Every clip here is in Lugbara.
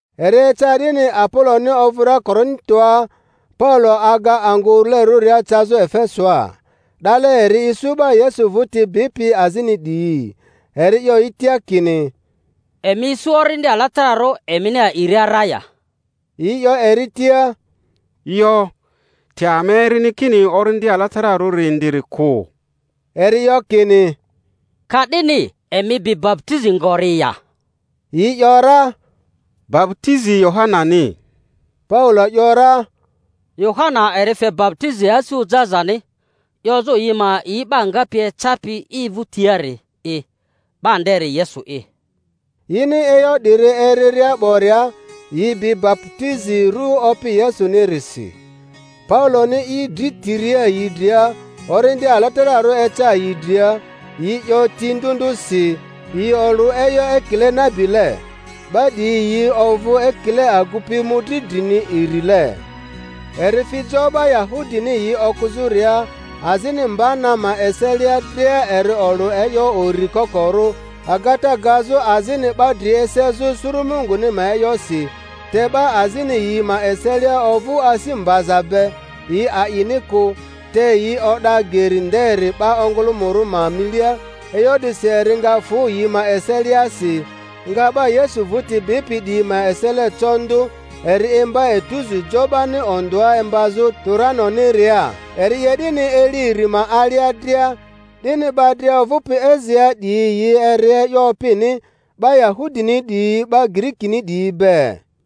Eri eca 'dini Apoloni ovᴜria Korintoa, Paulo aga angᴜ urulerᴜria cazᴜ Efesoa. 'Dale eri isu 'ba Yesu vᴜti bipi azini 'diyi. Eri 'yo yi tia kini, Emi isu Orindi Alatararᴜ emini a'iria ra ya? Yi 'yo eri tia, Yo, te ama erini kini Orindi Alatararᴜri indiri kᴜ. Eri 'yo kini, Ka'dini emi bi baputizi ngori ya? Yi ‘yora, Baputizi Yohanani. Paulo ‘yora, Yohana eri fe baputizi asi ojazani, 'yozᴜ yi ma a'i 'ba ngapi ecapi i vᴜtiari'i, 'ba nderi Yesu'i. Yini e'yo 'diri eriria 'boria, yi bi baputizi ru Opi Yesuni-risi. Pauloni i dri tiria yi dria, Orindi Alatararᴜ eca yi dria; yi 'yo ti ndᴜ ndᴜsi, yi olᴜ e'yo ekile nabile. 'Ba 'diyi yi ovᴜ ekile agupi mᴜdri drini irile. Eri fi jo 'ba Yahudini yi okᴜzᴜria, azini mba na ma eselia dria eri olᴜ e'yo uri kokorᴜ, agata gazᴜ azini 'ba dri esezᴜ suru Munguni ma e'yosi; te 'ba azini yi ma eselia ovᴜ asi mbaza be, yi a'ini kᴜ, te yi o'da Geri nderi 'ba ongᴜlᴜmᴜrᴜ ma milia; e'yo 'disi eri nga fᴜ yi ma eseliasi, nga 'ba Yesu vᴜti bipi 'diyi ma esele co ndᴜ, eri imba etuzu jo 'bani ondᴜa imbazᴜ Turanoniria. Eri 'ye 'dini eli iri ma alia dria, 'dini 'ba dria ovᴜpi Asiaa 'diyi yi eri e'yo Opini, 'ba Yahudini 'diyi 'ba Girikini 'diyi be.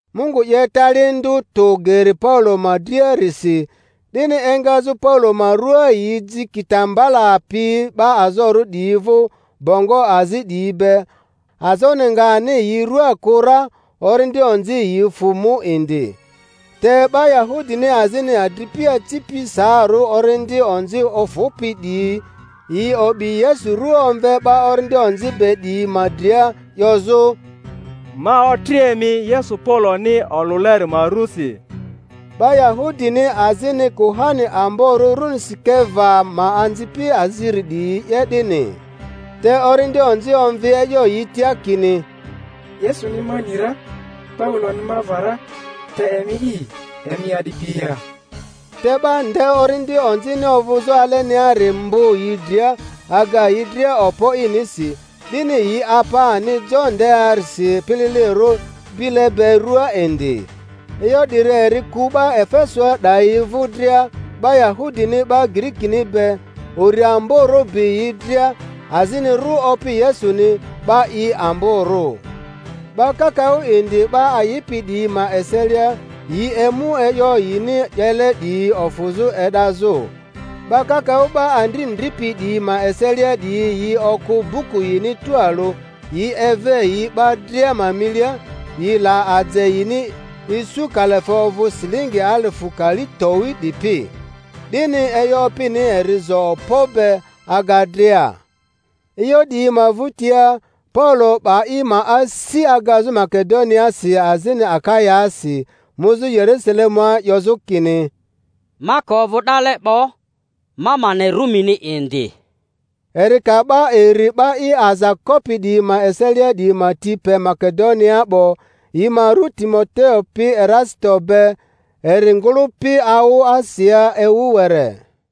Mungu 'ye tali ndᴜ tᴜ geri Paulo ma driarisi, 'dini engazᴜ Paulo ma ruaa yi ji kitambala pi 'ba azorᴜ 'diyi vᴜ, bongo azi 'diyi be, azoni nga ani yi rua kᴜ ra, orindi onzi yi fᴜ mu indi. Te 'ba Yahudini azini, adripi acipi saarᴜ orindi onzi ofᴜpi 'diyi, yi o'bi Yesu ru omve 'ba orindi onzi be 'diyi ma dria, 'yozᴜ, Ma otri emi Yesu Pauloni olᴜleri ma rusi. 'Ba Yahudini azini, kuhani amborᴜ runi Sikeva ma anzipi aziri 'diyi 'ye 'dini. Te orindi onzi omvi e'yo yi tia kini, Yesuni ma ni ra, Pauloni ma va ra, te emi'i, emi a'dipi ya? Te 'ba nde orindi onzini ovᴜzᴜ aleniari mbᴜ yi dria, aga yi dria okpo inisi, 'dini yi apa ani jo ndearisi pililirᴜ bile be rᴜaa indi. E'yo 'diri eri ku 'ba Efesoa 'dayi vᴜ dria, 'ba Yahudini 'ba Girikini be; uri amborᴜ bi yi dria; azini rᴜ Opi Yesuni 'ba i amborᴜ. 'Ba kakaᴜ indi 'ba a'ipi 'diyi ma eselia, yi emu e'yo yini 'yele 'diyi ofᴜzᴜ e'dazᴜ. 'Ba kakaᴜ 'ba andri ndripi 'diyi ma eselia 'diyi yi okᴜ buku yini tualᴜ, yi eve yi 'ba dria ma milia; yi la aje yini, isu kalafe ovᴜ silingi alifᴜ kali towi 'dipi. 'Dini e'yo Opini eri zo okpo be, aga dria. E'yo 'diyi ma vᴜtia, Paulo 'ba i ma asi agazᴜ Makedoniaasi azini Akayaasi, muzᴜ Yerusalemua, 'yozᴜ kini, Ma ka ovᴜ 'dale 'bo, ma ma ne Rumini indi. Eri ka 'ba iri 'ba i aza kopi 'diyi ma eselia 'diyi ma ti pe Makedoniaa 'bo, yi ma ru Timoteo pi Erasito be, eri ngᴜlᴜpi awᴜ Asiaa ewu were.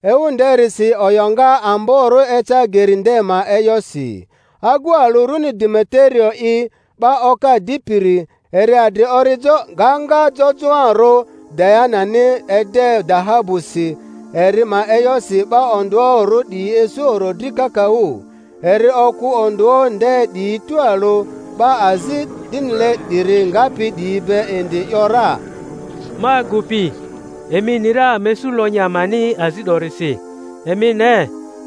Ewu nderisi o'yoŋa amborᴜ eca Geri nde ma e'yosi. Agu alᴜ runi Demeterio'i, 'ba oka dipiri, eri adri orijo gaŋa jojoarᴜ Dianani ede dahabusi, eri ma e'yosi 'ba ondᴜoᴜrᴜ 'diyi isu orodri kakaᴜ. Eri okᴜ ondᴜoᴜ nde 'diyi tualᴜ 'ba azi 'dinile 'diri ngapi 'diyi be indi, ‘yora, Ma agupi, emi ni ra ama isu lonyi amani azi 'dorisi. Emi ne,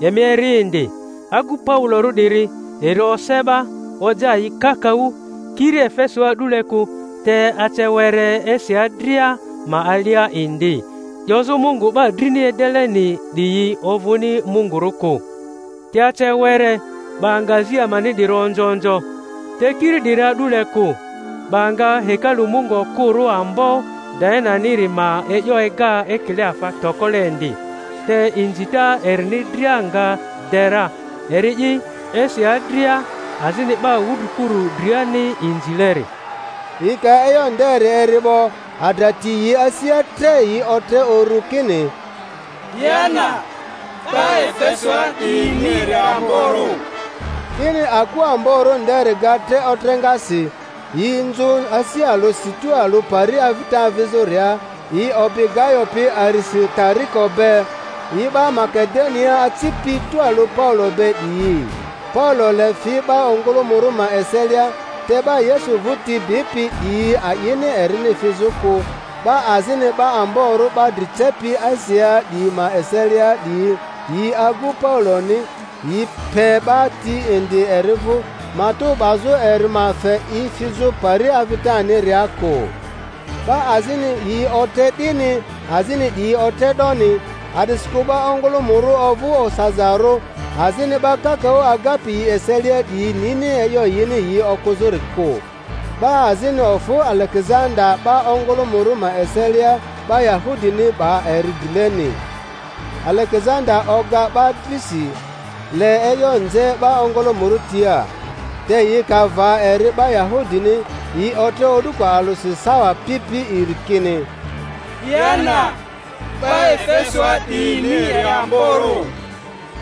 emi eri indi, agu Paulorᴜ 'diri eri ose 'ba, oja yi kakaᴜ, kiri Efesoa a'dule kᴜ te ace were Asia dria ma alia indi, 'yozᴜ mungu 'ba drini edeleni 'diyi ovᴜni mungurᴜ kᴜ. Te ace were 'ba nga azi amani 'diri onzo onzo, te kiiri 'diri a'dule kᴜ, 'ba nga hekalu mungu okᴜrᴜ ambo Diananiri ma e'yo ega ekile afa tokole indi, te inzita erini dria nga de ra, eri'i Asia dria azini 'ba wudrikuru driani inzileri. Yi ka e'yo nderi eri 'bo, adra ti yi asia tre, yi otre urᴜ kini, Diana 'ba Efesoa 'diyini eri amborᴜ! 'Dini aku amborᴜ nderi ga tre otreŋasi; yi nzᴜ asi alᴜsi tualᴜ pari avita avizᴜria, yi obi Gayo pi Arisitariko be, yi 'ba Makedoniaa acipi tualᴜ Paulo be 'diyi. Paulo le fi 'ba ongᴜlᴜmᴜrᴜ ma eselia, te 'ba Yesu vᴜti bipi 'diyi a'ini erini fizᴜ kᴜ; 'ba azini 'ba amborᴜ 'ba dri cepi Asiaa 'diyi ma eselia 'diyi, yi agu Pauloni, yi pe 'ba ti indi eri vᴜ, matᴜ 'bazᴜ eri ma fe i fizᴜ pari avitaniria kᴜ. 'Ba azini yi otre 'dini, azini 'diyi otre 'doni; a'disikᴜ 'ba ongᴜlᴜmᴜrᴜ ovᴜ osazarᴜ, azini 'ba kakaᴜ agapi yi eselia 'diyi nini e'yo yini yi okᴜzᴜri kᴜ. 'Ba azini ofᴜ Alegezanda 'ba ongᴜlᴜmᴜrᴜ ma eselia, 'ba Yahudini 'ba eri drileni. Alegezanda oga 'ba drisi, le e'yo nze 'ba ongᴜlᴜmᴜrᴜ tia. Te yi ka va eri 'ba Yahudini, yi otre o'duko alᴜsi sawa pi pi iri kini, Diana 'ba Efesoa 'diyini eri amborᴜ!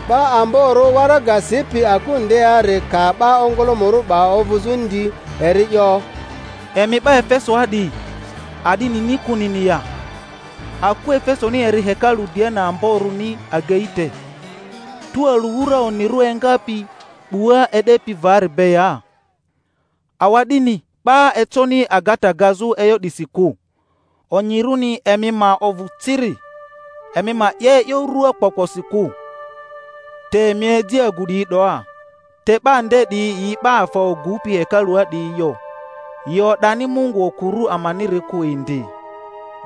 'Ba amborᴜ waraga sipi aku ndeari ka 'ba ongᴜlᴜmᴜrᴜ 'ba ovᴜzᴜ ndi, eri 'yo, Emi 'ba Efesoa 'diyi, a'di nini kᴜnini ya, aku Efesoni eri hekalu Diana amborᴜni agei te, tualᴜ wura onirᴜ engapi 'bua e'depi vari be ya? Awa'dini 'ba econi agata gazᴜ e'yo 'disi kᴜ, onyirᴜni emi ma ovᴜ ciri, emi ma 'ye e'yo rᴜakpokposi kᴜ. Te emi eji agu 'diyi 'doa, te 'ba nde 'diyi yi 'ba afa ogupi hekalua 'diyi yo, yi o'dani mungu okᴜrᴜ amaniri kᴜ indi.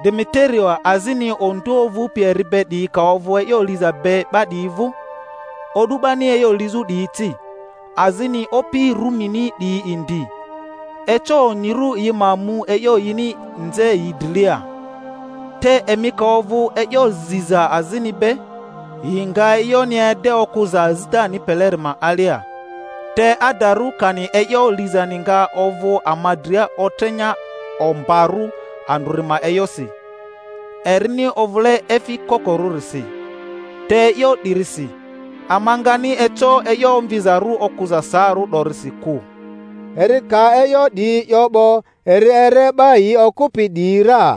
Demeterio azini ondᴜoᴜ ovᴜpi eri be 'diyi ka ovᴜ e'yo liza be 'ba 'diyi vᴜ, o'du 'bani e'yo lizᴜ 'diyi ci, azini opi Rumini 'diyi indi, eco onyirᴜ yi ma mu e'yo yini nze yi drilia. Te emi ka ovᴜ e'yo ziza azini be, yi nga e'yoni ede okᴜza azitani peleri ma alia. Te adarᴜ kani e'yo lizani nga ovᴜ ama dria otreŋa ombarᴜ andrᴜri ma e'yosi, erini ovᴜle efi kokorᴜrisi; te e'yo 'dirisi ama ngani eco e'yo omvizarᴜ okᴜza saarᴜ 'dorisi kᴜ. Eri ka e'yo 'diyi 'yo 'bo, eri ere 'ba yi okᴜpi 'diyi ra.